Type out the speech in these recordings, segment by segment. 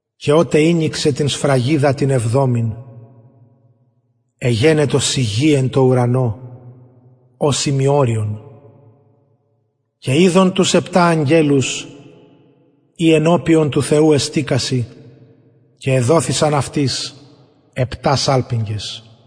και οτε ηνοιξεν την σφραγιδα την εβδομην εγενετο σιγη εν τω ουρανω ως ημιωριον και ειδον τους επτα αγγελους οι ενωπιον του θεου εστηκασιν και εδοθησαν αυτοις επτα σαλπιγγες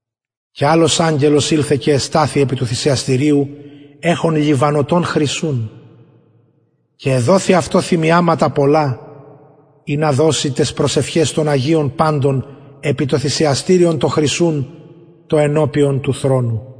και αλλος αγγελος ηλθεν και εσταθη επι του θυσιαστηριου εχων λιβανωτον χρυσουν και εδοθη αυτω θυμιαματα πολλα ινα δωση ταις προσευχαις των αγιων παντων επι το θυσιαστηριον το χρυσουν το ενωπιον του θρονου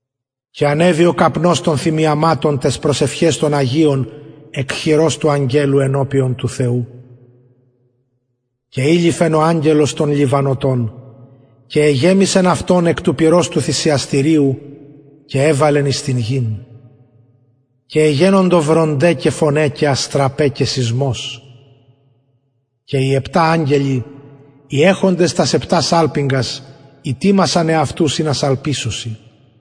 και ανεβη ο καπνος των θυμιαματων ταις προσευχαις των αγιων εκ χειρος του αγγελου ενωπιον του θεου και ειληφεν ο αγγελος τον λιβανωτον και εγεμισεν αυτον εκ του πυρος του θυσιαστηριου και εβαλεν εις την γην και εγενοντο βρονται και φωναι και αστραπαι και σεισμος και οι επτα αγγελοι οι εχοντες τας επτα σαλπιγγας ητοιμασαν εαυτους ινα σαλπισωσιν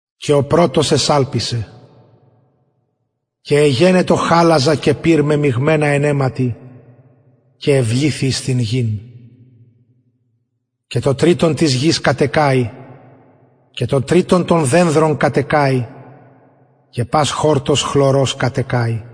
και ο πρωτος εσαλπισεν και εγενετο χαλαζα και πυρ μεμιγμενα εν αιματι και εβληθη εις την γην και το τριτον της γης κατεκαη και το τριτον των δενδρων κατεκαη και πας χορτος χλωρος κατεκαη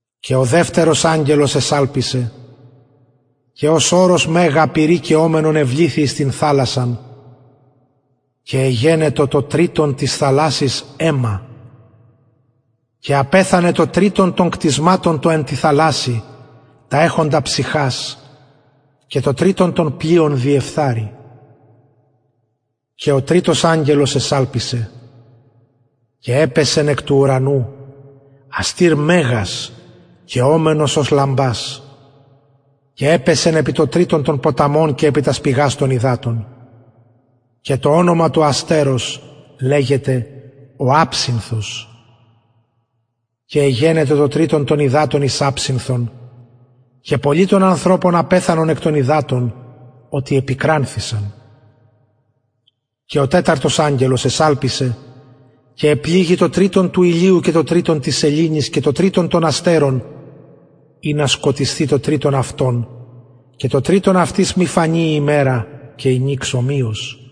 και ο δευτερος αγγελος εσαλπισεν και ως ορος μεγα καιομενον εβληθη εις την θαλασσαν και εγενετο το τριτον της θαλασσης αιμα και απεθανεν το τριτον των κτισματων εν τη θαλασση τα εχοντα ψυχας και το τριτον των πλοιων διεφθαρη και ο τριτος αγγελος εσαλπισεν και επεσεν εκ του ουρανου αστηρ μεγας καιομενος ως λαμπας και επεσεν επι το τριτον των ποταμων και επι τας πηγας των υδατων και το ονομα του αστερος λεγεται ο αψινθος και εγενετο το τριτον των υδατων εις αψινθον και πολλοι των ανθρωπων απεθανον εκ των υδατων οτι επικρανθησαν και ο τεταρτος αγγελος εσαλπισεν και επληγη το τριτον του ηλιου και το τριτον της σεληνης και το τριτον των αστερων ινα σκοτισθη το τριτον αυτων και το τριτον αυτης μη φανη η ημερα και η νυξ ομοιως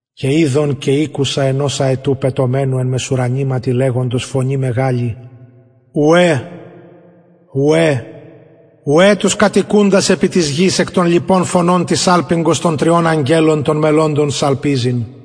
και ειδον και ηκουσα ενος αετου πετομενου εν μεσουρανηματι λεγοντος φωνη μεγαλη ουαι ουαι ουαι τοις κατοικουσιν επι της γης εκ των λοιπων φωνων της σαλπιγγος των τριων αγγελων των μελλοντων σαλπιζειν